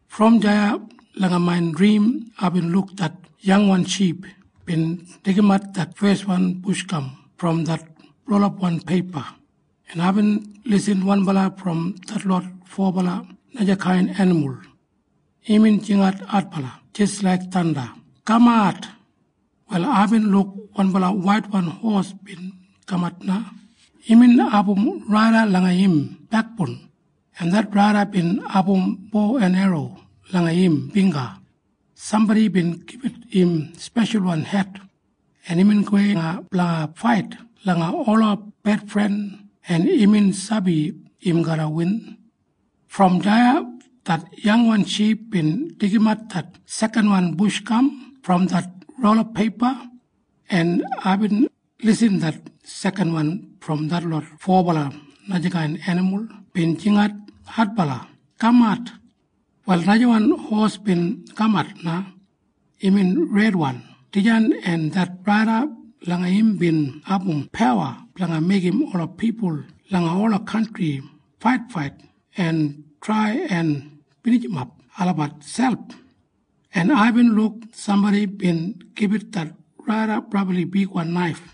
Brom deya langa main drim aibin luk det yangwan ship bin deigimat det feswan bush gam brom det rolapwan peipa, en aibin lisin wanbala brom detlot fobala najakain enimul. Imbin jingat adbala jis laik thanda, “Kamat!” Wal aibin luk wanbala waitwan hos bin kamat na. Imbin abum raida langa im bekboun, en det raida bin abum bo en erro langa im bingga. Sambodi bin gibit im speshalwan het, en imbin gowei na blanga fait langa ola bedfren, en imbin sabi im garra win. Brom deya det yangwan ship bin deigimat det sekanwan bush gam brom det rolapwan peipa, en aibin lisin det sekanwan brom detlot fobala najakain enimul bin jingat adbala, “Kamat!” Wal najawan hos bin kamat na. Imbin redwan dijan, en det raida langa im bin abum pawa blanga meigim ola pipul langa ola kantri faitfait en trai en binijimap olabat selp, en aibin luk sambodi bin gibit det raida brabli bigwan naif.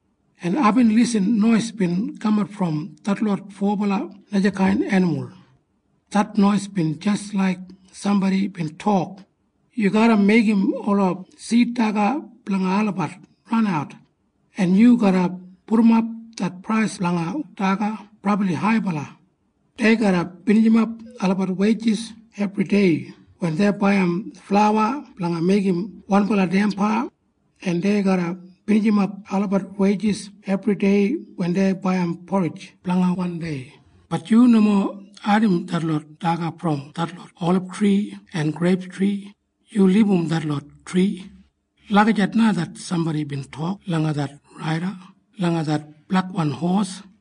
en aibin lisin nois bin kamat brom detlot fobala najakain enimul. Det nois bin jis laik sambodi bin tok, “Yu garra meigim ola sid daga blanga olabat ranat, en yu garra pudumap det prais blanga daga brabli haibala. Dei garra binijimap olabat weijis ebridei wen dei baiyim flauwa blanga meigim wanbala damba, en dei garra binijimap olabat weijis ebridei wen dei baiyim porij blanga wan dei. Bat yu nomo kilimbat detlot daga brom detlot olibtri en greiptri. Yu libum detlot tri.” Lagijat na det sambodi bin tok langa det raida langa det blekwan hos.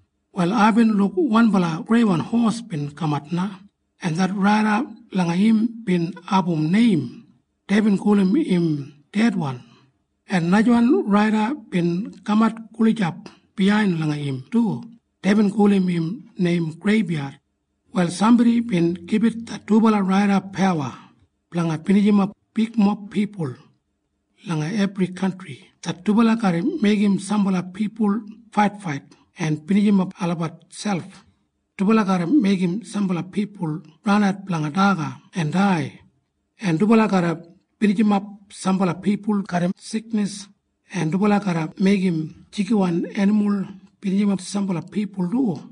Wal aibin luk wanbala greiwan hos bin kamat na, en det raida langa im bin abum neim. Deibin gulum im Dedwan. En najawan raida bin kaman gulijap biyain langa im du. Deibin gulum im neim Greibyad. Wal sambodi bin gibit det dubala raida pawa blanga binijimap bigmob pipul. Langa ebri kantri det dubala garra meigim sambala pipul faitfait en binijimap miselp. Dubala garra meigim sambala pipul ranat blanga daga en dai, en dubala garra binijimap sambala pipul garram siknis, en dubala garra meigim jigiwan enimul binijimap sambala pipul du.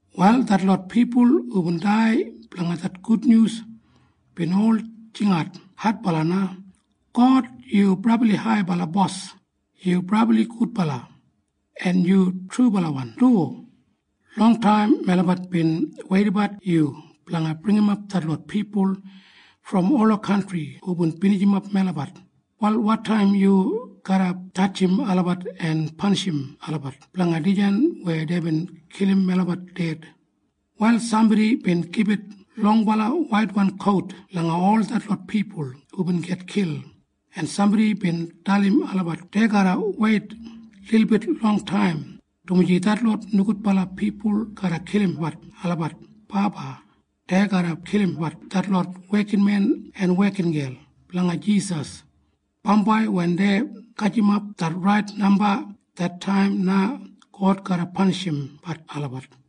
Wal detlot pipul hubin dai blanga det gudnyus bin ol jingat adbala na, “God, yu Brabli Haibala Bos. Yu brabli gudbala, en yu trubalawan du. Longtaim melabat bin weidabat yu blanga bringimap detlot pipul brom ola kantri hubin binijimap melabat. Wal wotaim yu garra jadjim olabat en panishim olabat blanga dijan weya deibin kilim melabat ded?” Wal sambodi bin gibit longbala waitwan kout langa ol detlot pipul hubin gitkil, en sambodi bin dalim olabat dei garra weit lilbit longtaim. Dumaji detlot nogudbala pipul garra kilimbat olabat baba. Dei garra kilimbat detlot wekinmen en wekingel blanga Jisas. Bambai wen dei gajimap det rait namba, det taim na God garra panishimbat olabat.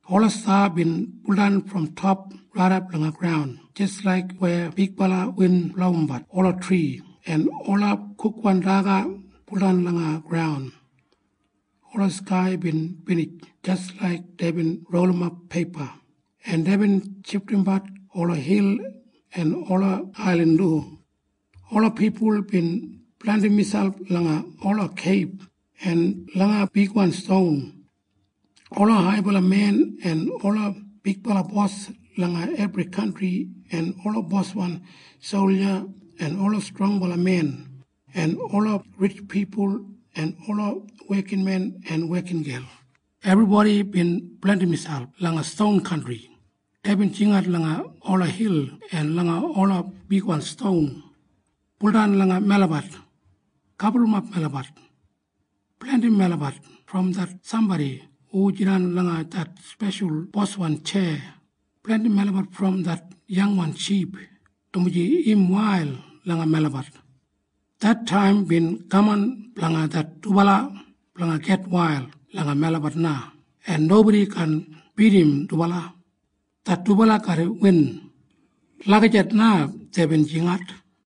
Ola sta bin buldan brom top raidap langa graun jis laik weya bigbala win blowimbat ola tri en ola kukwan daga buldan langa graun. Ola skai bin binij jis laik deibin rolimap peipa, en deibin shifdimbat ola hil en ola ailin du. Ola pipul bin blandim miselp langa ola keib en langa bigwan ston. Ola haibala men en ola bigbala bos langa ebri kantri, en ola boswan solja en ola strongbala men, en ola ritj pipul en ola wekinmen en wekingel, ebribodi bin blandim miselp langa ston kantri. Deibin jingat langa ola hil en langa ola bigwan ston, “Buldan langa melabat! Gaburrumap melabat! Blandim melabat brom det sambodi hu jidan langa det speshal boswan tjeya! Blandim melabat brom det yangwan ship, dumaji im wail langa melabat! Det taim bin kaman blanga det dubala blanga gitwail langa melabat na, en nobodi kaan bidim dubala. Det dubala garra win.” Lagijat na deibin jingat.